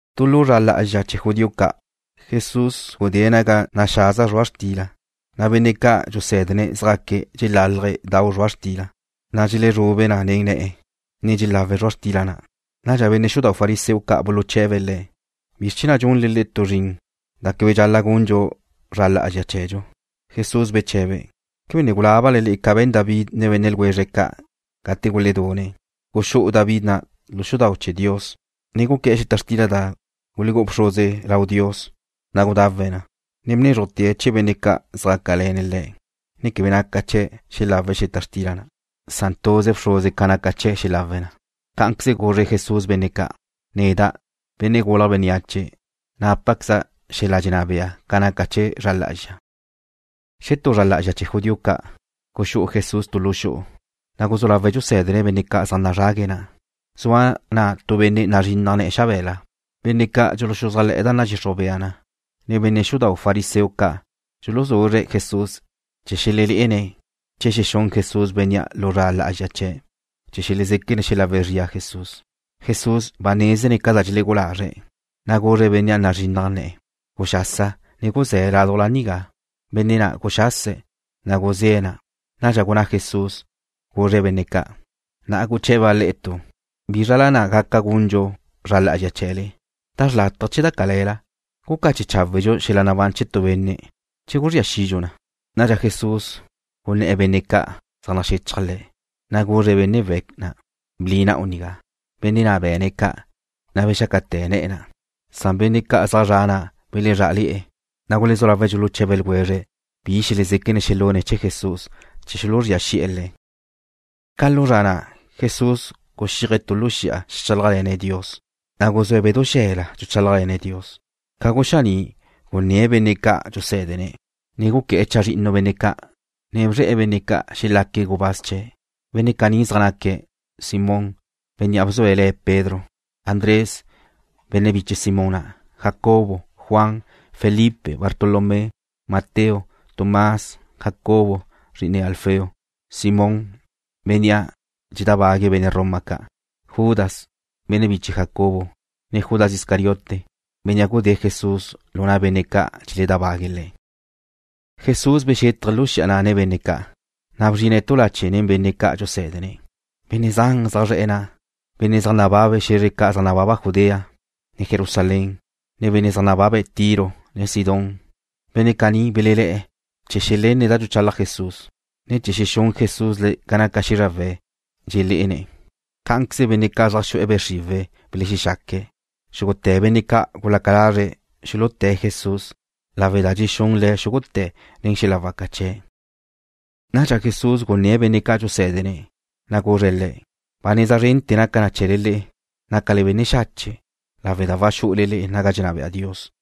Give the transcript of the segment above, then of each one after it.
Tu lu zra lá'azxa chee̱ judío ca', gudé Jesús naga naxaza zrua' xtila, na' benne' ca' dxusé̱dene̱' zjaque̱' dxelálaje̱' dau zrua' xtila, na' dxelezrube na nen ne̱'e̱, ne dxelawe̱' zrua' xtila na'. Nadxa benne' xudau' fariseo ca' buluche̱be̱' le̱': ―¿Bizr chee̱ na' dxunle le'e tu zrin da quebe naca na gunle zra lá'azxa chee̱dxu? Jesús beche̱be̱': ―¿Quebe ne gulábale le'e ca be̱n David ne benne' ljwezre̱' ca' gate guledune̱'? Guxú'u David na' tu lu xudau' chee̱ Dios, ne guqué̱'e̱ xeta xtila da gulú'u bxruze lau Dios, na' gudawe̱' na, ne bnézrujte̱' chee̱ benne' ca' zjácale̱ne̱' le̱', ne quebe naca chee̱' xelawe̱' xeta xtila na'. Tuze bxruze ca' naca chee̱' xelawe̱' na. Cá'anqueze guzre Jesús benne' ca': ―Neda', Benne' Gulje̱' Bénneache, nápaqueza' xel-la dxenná bea ca naca chee̱ zra lá'azxa. Xetú lu zra lá'azxa chee̱ judío ca', guxú'u Jesús tu lu xu'u, na' guzú lawe̱' dxusé̱dene̱' benne' zaj nazrague̱' na'. Zua na' tu benne' nazrinnaj ne̱'e̱ xabe̱la. Benne' ca' dxuluxuzájle̱'e̱ da nadxixruj bea na, ne benne' xudau' fariseo ca' dxuluzuzre̱' Jesús chee̱ xelelé'ene̱' che xexún Jesús bénnea' lu zra lá'azxa chee̱', chee̱ xelezéquene̱' xelawe' zria Jesús. Jesús ba nézene̱' ca da dxelegú'u lazre̱', na' guzre̱' bénnea' nazrinnaj ne̱'e̱: ―Guxasa, ne guzé̱ laduj nigá. Benne' na' guxase̱', na' guzé̱' na'. Nadxa gunná Jesús, guzre̱' benne' ca': ―Na'a guche̱ba' le'e tu: ¿Bízrala na' waca gundxu zra lá'azxa chee̱le, da xrlátaje che da cale̱la? ¿Gucache cháwedxu xel-la nabán chee̱ tu benne', che guzría xidxu na? Nadxa Jesús guné̱'e̱ benne' ca' zaj naxechaj Le̱', na' guzre̱' benne' we̱' na': ―Bli na'u nigá. Benne' na' be̱ne̱' ca', na' bexácate̱ ne̱'e̱ na'. Na' benne' ca' zaj zre̱'e̱ na' belezrá'ale̱'e̱, na' gulezú lawe̱' dxuluche̱be ljwezre̱' bi xelezéquene̱' xelune̱' chee̱ Jesús chee̱ xuluzría xi'e̱ Le̱'. Ca lu zra na' Jesús guxíaje̱' tu lu xi'a xeajchálajle̱ne̱' Dios, na' guzúe̱' bedú xe̱la dxuchálajle̱ne̱' Dios. Ca guxaní' gunné̱' benne' ca' dxusé̱dene̱', ne guqué̱'e̱ chazrinnu benne' ca', na' bzre̱'e̱ benne' ca' xelaque̱' gubáz chee̱'. Benne' caní zaj naque̱': Simón, (bénnea' bzue̱' le̱' Pedro), Andrés, (benne' biche Simón na'), Jacobo, Juan, Felipe, Bartolomé, Mateo, Tomás, Jacobo, (zri'ine Alfeo), Simón, (bénnea' dxedábague̱' benne' Roma ca') Judas, (benne' biche Jacobo), ne Judas Iscariote, (bénnea' gudée̱' Jesús lu na' benne' ca' dxeledábague̱' Le̱'.) Jesús bdinne̱' lu xi'a na' nen benne' ca' dxusé̱dene̱', na' bzrine̱' tu lache' nen benne' ca'. Benne' zan zaj zre̱'e̱ na' zaj nababe̱' xe̱zre ca' zaj nababa Judea, ne Jerusalén, nen benne' zaj nababe̱' Tiro, ne Sidón. Benne' caní belelé̱'e̱ chee̱ xelenne̱' da dxuchalaj Jesús, ne chee̱ xexún Jesús le̱' ca naca xízrawe̱' dxeledxé'ene̱'. Cá'anqueze benne' ca' zaj xu'e̱ be' xriwe̱' belexaque̱'. Xúgute̱ benne' ca' gulaca lazre̱' xuluté̱' Jesús lawe' da dxexún Le̱' xúgute̱' nen xel-la waca chee̱'. Nadxa Jesús gunné̱'e̱ benne' ca' dxusé̱dene̱', na' guzre̱' le̱': ―Ba neza zrente̱ naca na chee̱le le'e, dxéquebe'ele nácale benne' xache', lawe' da waxú'ule le'e naga dxenná bea Dios.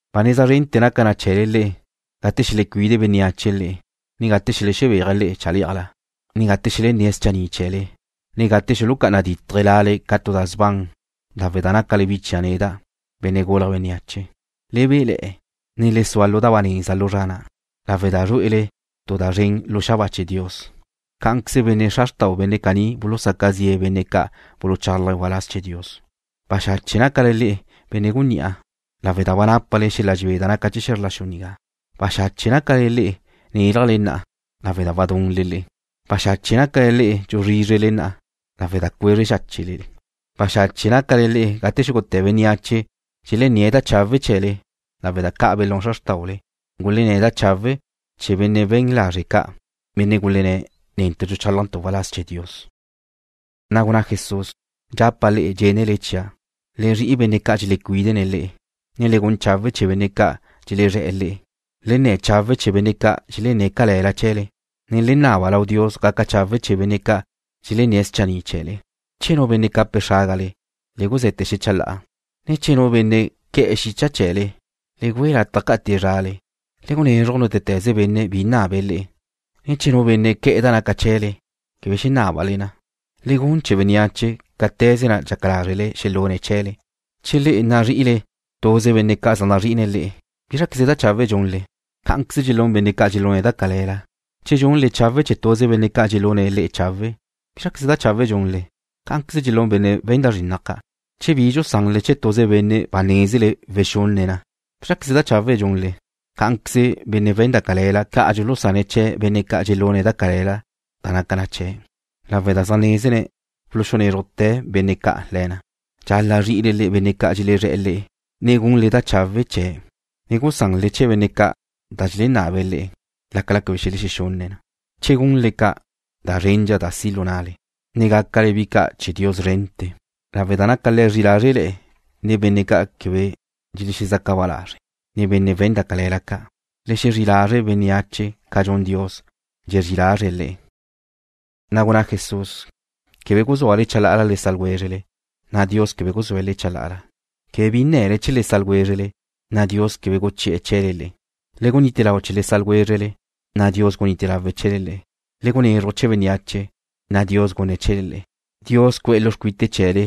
’Ba neza zrente̱ naca na chee̱le le'e, gate xelecuide bénneache le'e, ne gate xelexebéaje̱' le'e chalé'ajla, ne gate xelenné̱' schanni' chee̱le, ne gate xulucá'ana ditje̱' lale ca tu da sban lawe' da nácale bi chia' neda', Benne' Gulje̱' Bénneache. Le béle̱'e̱, ne le sua lu da ba neza lu zra na' lawe' da zrué'ele tu da zren lu xabáa chee̱ Dios. Cá'anqueze benne' xra xrtau benne' caní bulusaca zi'e̱ benne' ca' buluchálajé̱' waláz chee̱ Dios. ’Baxache' nácale le'e, benne' gunní'a, lawe' da ba nápale xel-la dxebé da naca chee̱ xe̱zr la xu nigá. ’Baxache' nácale le'e, nélajle na'a, lawe' da wadunle le'e. ’Baxache' nácale le'e dxuzrízrele na'a, lawe' da cuezre xáchele. ’Baxache' nácale le'e gate xúgute̱ bénneache dxelenné̱' da chawe' chee̱le, lawe' da ca' belún xra xrtáule, gulenné̱' da chawe' chee̱ benne' we̱n lazre' ca', benne' gulenné̱': “Netu' dxuchálajntu' waláz chee̱ Dios.” Na' gunná Jesús: ―Dxapa' le'e dxénele chia', le zri'i benne' ca' dxelecuídene̱' le'e, ne le gun chawe' chee̱ benne' ca' dxelezré̱'e̱ le'e. Le nne̱ chawe' chee̱ benne' ca' dxelenné̱' cale̱la chee̱le, ne le naba lau Dios gaca chawe' chee̱ benne' ca' dxelenné̱' schanni' chee̱le. Che nu benne' cape̱' xrágale, le guze̱te̱ xecha la'a, ne che nu benne' que̱'e̱ xicha chee̱le, le güe lataj ca'ate̱' zrale. Le gunezruj nútete̱ze benne' bi nabe̱' le'e, ne che nu benne' que̱'e̱ da naca chee̱le, quebe xenábale na. Le gun chee̱ bénneache cáte̱ze na' dxaca lázrele xelune̱' chee̱le. ’Che le'e nazri'ile tuze benne' ca' zaj nazrí'ine̱' le'e, ¿bízraqueze da chawe' dxunle? Cá'anqueze dxelún benne' ca' dxelune̱' da cale̱la. Che dxunle chawe' chee̱ tuze benne' ca' dxelune̱' le'e chawe', ¿bízraqueze da chawe' dxunle? Cá'anqueze dxelún benne' we̱n da zrinnaj ca'. Che bi dxusanle chee̱ tuze benne' ba nézele wexunne̱' na, ¿bízraqueze da chawe' dxunle? Cá'anqueze benne' we̱n da cale̱la ca' dxulusane̱' da naca chee̱' chee̱ benne' ca' dxelune̱' da cale̱la, lawe' da zaj nézene̱' wulunézrujte̱ benne' ca' le̱ na. Dxal-la' zri'ile le'e benne' ca' dxelezré̱'e̱ le'e, ne gunle da chawe' chee̱', ne gusanle chee̱ benne' ca' da xelenabe̱' le'e, lácala quebe xelexexunne̱' na. Che gunle ca', da zrendxa da si' lu na'le, ne gácale bi ca' chee̱ Dios szrente̱, lawe' da naca Le̱' zri'i lazre' nen benne' ca' quebe dxelexezaca ba lazre̱', ne benne' we̱n da cale̱la ca'. Le xezrí lazre' bénneache ca dxun Dios, dxezrí lazre̱' le'e. Na' gunná Jesús: ―Quebe guzúale chalá'ala le sa' ljwézrele, na' Dios quebe guzúe̱' le'e chalá'ala. Quebe bi nne̱le chee̱ le sa' ljwézrele, na' Dios quebe guchi'e̱ chee̱le le'e. Le gunite lau chee̱ le sa' ljwézrele, na' Dios gunite lawe̱' chee̱le le'e. Le gunezruj chee̱ bénneache, na' Dios gunne̱' chee̱le le'e. Dios cu'e̱ lu xcuite chee̱le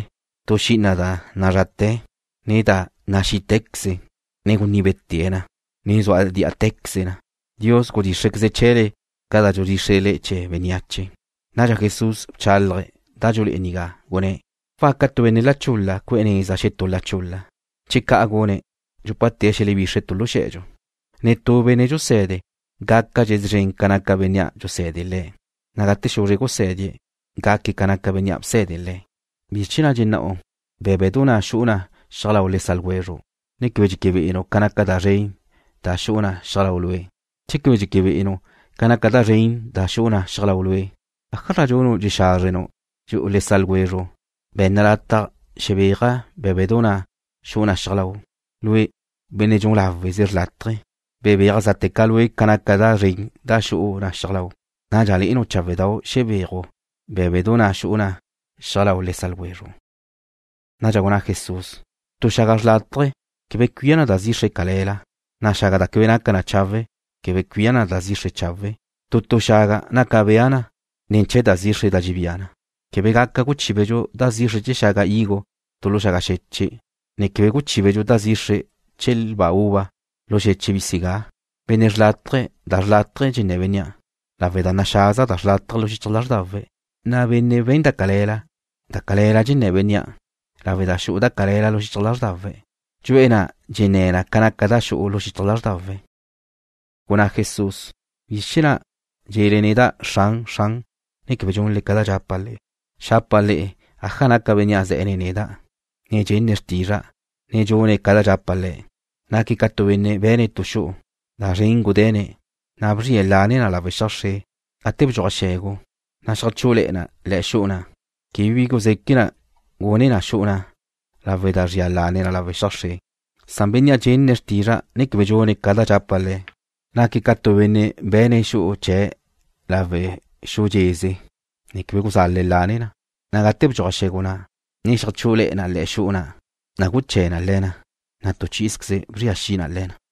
tu xi'ina da nálate̱, ne da naxí'tequeze, ne guníbete̱' na, ne sua dí'atequeze na. Dios gudxíxrequeze̱' chee̱le ca da dxudxíxrele chee̱ bénneache. Nadxa Jesús bchálaje̱' da dxulé'e nigá, gunné̱': ―¿Waca tu benne' la chul-la cu'e̱ neza xetú la chul-la? Che ca' gune̱', dxúpate̱' xelebixre̱' tu lu xe̱dxu. Netú benne' dxuse̱de gácadxe̱' szren ca naca bénnea' dxusé̱dene̱' le̱', na' gate xuzre gusé̱die̱', gaque̱' ca naca bénnea' bsé̱dene̱' le̱'. ’¿Bizr chee̱ na' dxenná'u bé̱bedu na' xu'u na xiaj lau le sa' ljwezru', ne quebe dxéquebe'enu' ca naca da zren da xu'u na xiaj lau' lue'? Che quebe dxéquebe'enu' ca naca da zren na' da xu'u na xiaj lau' lue', ¿ájazra dxunu' dxexázrenu' dxu'u le sa' ljwezru': “Be̱nna lataj xebéaja' bé̱bedu na' xu'u na xiaj lau'?” Lue', benne' dxun láweze xrlátaje, bebéaj zá'teca lue' ca naca da zren da xu'u na xiaj lau', na' nadxa le'enu' cháwedau' xebéaju' bé̱bedu na' xu'u na xiaj lau le sa' ljwezru'. Nadxa gunná Jesús: ―Tu xaga xrlátaje quebe cuía na da zixre cale̱la, na' xaga da quebe naca chawe' quebe gaca cuía na da zixre chawe'. Tu tu xaga naca bea na ne̱ chee̱ da zixre da dxebía na. Quebe gaca guchíbedxu da zixre chee̱ xaga higo tu lu xaga xeche', ne quebe guchíbedxu da zixre chee̱ lba uva lu xeche' bisigá. Benne' xrlátaje, da xrlátaje dxenné̱ bénnea' lawe' da naxaza da xrlátaje lu xichaj lázrdawe̱', na' benne' we̱n da cale̱la, da cale̱la dxenné̱ bénnea' lawe' da xu'u da cale̱la lu xichaj lázrdawe̱'. Dxu'e̱ na' dxenné̱ na ca naca da xu'u lu xichaj lázrdawe̱'. Gunná Jesús: ―¿Bizr chee̱ na' dxe̱le neda': “Xran, Xran”, ne quebe dxunle ca da dxapa' le'e? Xapa' le'e aja naca bénnea' ze̱'e̱ nen neda', ne dxenne̱' xrtizra'a, ne dxune̱' ca da dxapa' le̱'. Naque̱' ca tu benne' be̱ne̱' tu xu'u. Da zren gude̱ne̱', na' bzrie̱' lane na lawe' xiaj xre. Gate bdxuaj xe̱gu, na' xeajchú'ule̱'e̱ na le̱'e̱ xu'u na', quebe bi guzeque' gune na xu'u na' lawe' da zria lane na lawe' xiaj xre. Na' bénnea' dxenne̱' xrtizra'a, ne quebe dxune̱' ca da dxapa' le̱', naque̱' ca tu benne' be̱ne̱' xu'u chee̱' lawe' xu dxeze, ne quebe guzale̱' lane na, na' gate bdxuaj xe̱gu na', ne xeajchú'ule̱'e̱ na le̱'e̱ xu'u na', na' guché̱ na le̱ na, na' tu chí'izqueze bzria xi na le̱ na.